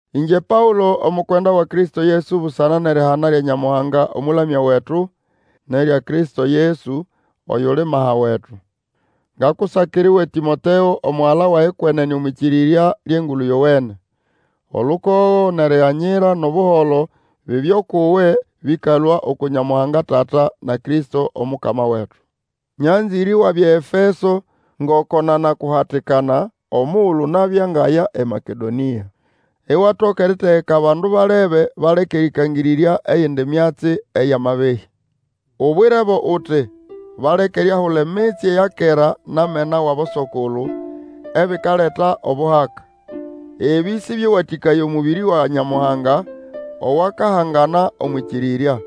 Ĩngye Paũlo, omukwenda wa Kristo Yesu busana nʼerihana lya Nyamuhanga Omũlamya wetu, nʼerya Kristo Yesu, oyuli maha wetu. Ngakusakira uwe Tĩmoteo, omugala wage kwenene omwʼĩkĩrĩrya lyʼEngulu Yowene. Olukogo, nʼeriganyira, nʼobuholo, bibye ukʼuwe, bĩkalũa uku Nyamuhanga Tata, na Kristo Omukama wetu. Nyanzĩre iwabya eEfeso, ngoko nanakuhatikana omugulu nabya ngaya eMakedonia. Iwatoka eritegeka abandu balebe baleke erĩkangĩrĩrya eyindi myatsi eyʼamabehĩ. Ubwirebo uti, baleke eriahula emitsye ya kera nʼamena wʼaboso-kulu, ebikaleta obuhaka. Ebĩ sĩbyewatĩkaya omũbĩrĩ wa Nyamuhanga, owakahangana omwʼĩkĩrĩrya.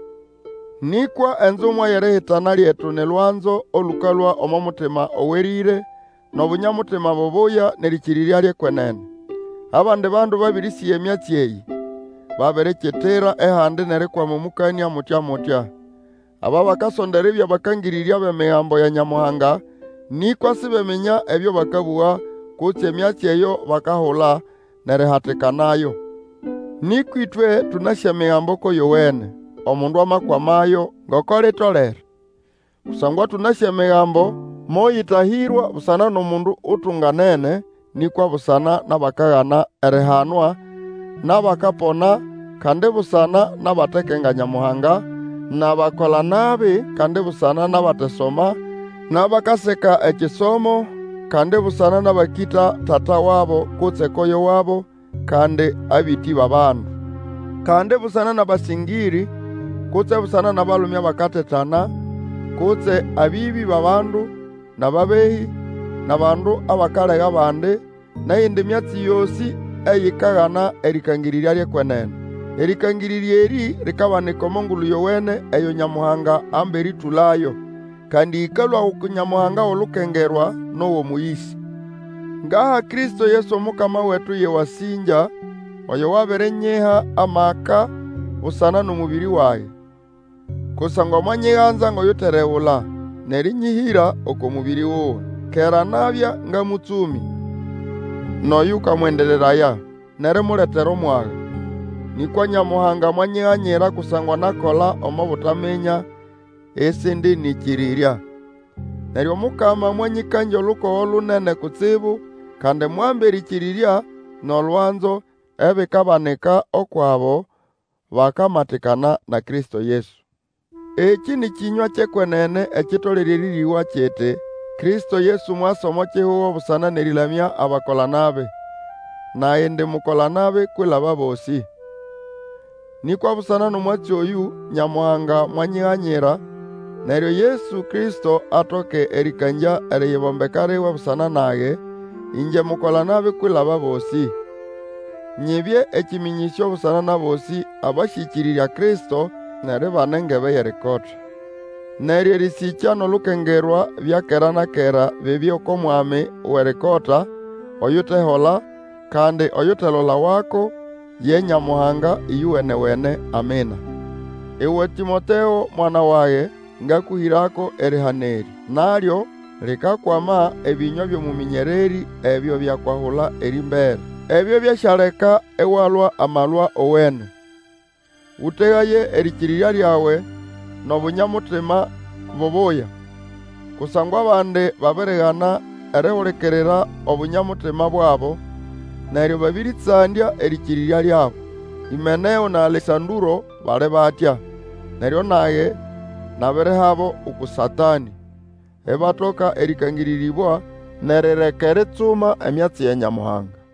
Nĩkwa enzumwa yʼerihana lyetu ni lwanzo olũkalũa omo mutima owerĩre, nʼobunya-mutima bubuya, nʼerĩkĩrĩrya lyʼekwenene. Abandi bandu babĩrĩsĩga emyatsi eyĩ, babirikitira ehandi nʼerikwama omũkanĩa mutya-mutya. Aba bakasonda eribya bakangĩrĩrya bʼEmigambo ya Nyamuhanga, nĩkwa sibeminya ebyo bakabũga, kutse emyatsi eyo bakahula, nʼerihatikanayo. Nĩkwa ĩtwe tũnasĩ Emigambo ko yowene, omundu amakwamayo ngoko litolere. Kusangwa tũnasĩ Emigambo moyĩtahĩrwa busana nʼomundu utunganene, nĩkwa busana nʼabakagana erihanwa, nʼabakapona, kandi busana nʼabatekenga Nyamuhanga, nʼabakola-nabi, kandi busana nʼabatesoma, nʼabakaseka ekisomo; kandi busana nʼabakĩta tata wabo kutse koyo wabo; kandi abĩtĩ bʼabandu, kandi busana nʼabasĩngĩrĩ, kutse busana nʼabalume abakatetana, kutse abĩbĩ bʼabandu, nʼababehĩ, nʼabandu abakalega bandi, nʼeyindi myatsi yosĩ eyikagana erĩkangĩrĩrya lyʼekwenene. Erĩkangĩrĩrya erĩ likabanika omo Ngulu Yowene eyo Nyamuhanga amba erĩtũlayo, kandi ĩkalũa uku Nyamuhanga wʼolukengerwa nʼowʼomũyĩsa. Ngaha Kristo Yesu Omukama wetu yʼewasĩngya, oyo wabirinyiha amaka busana nʼomũbĩrĩ wage. Kusangwa mwanyiganza ngʼoyuteregula, nʼerĩnyĩhĩra oko mũbĩrĩ wuwe. Kera nabya nga mũtsũmĩ, nʼoyũkamwendereraya, nʼerimuletera omwaga. Nĩkwa Nyamuhanga mwanyiganyira kusangwa nakola omo butaminya, ĩsĩndĩnĩkĩrĩrya. Neryo Omukama mwanyĩkangya olukogo lunene kutsibu, kandi mwamba erĩkĩrĩrya, nʼolwanzo, ebikabanĩka ukwʼabo bakamatikana na Kristo Yesu. Ekĩ nĩ kĩnywa kyʼekwenene ekitolere erĩrĩgwa kiti, Kristo Yesu mwasa omo kihugo busana nʼerĩlamya abakola-nabi. Nage indi mukola-nabi kwilaba bosĩ. Nĩkwa busana nʼomwatsi oyũ Nyamuhanga mwanyiganyira, neryo Yesu Kristo atoke erĩkangya eriyibombeka liwe busana nage, ĩngye mukola-nabi kwilaba abosĩ. Nyibye ekĩmĩnyĩsyo busana nʼabosĩ abasyĩkĩrĩrya Kristo nʼeribana engebe yʼerikota. Neryo erĩsĩkya nʼolukengerwa bya kera na kera bibye oko Mwami Wʼerikota, oyutehola, kandi oyutelolawako, ye Nyamuhanga ĩyowene-wene. Amina. Uwe Tĩmoteo, mwana wage, ngakũhĩrako erihana erĩ. Nalyo likakwama ebĩnywa byʼobũmĩnyererĩ ebyo byakwahula erĩmbere. Ebyo byasyaleka iwalwa amalwa owene. Ũtegaye erĩkĩrĩrya lyawe nʼobunya-mutima bubuya. Kusangwa abandi babirigana erihulikirira Obunya-mutima bwabo, neryo babĩrĩtsandya erĩkĩrĩrya lyabo. Hĩmeneo na Alesandũro bali batya, neryo nage nabirihabo uku Satanĩ, ibatoka erĩkangĩrĩrĩbwa nʼerireka eritsuma emyatsi ya Nyamuhanga.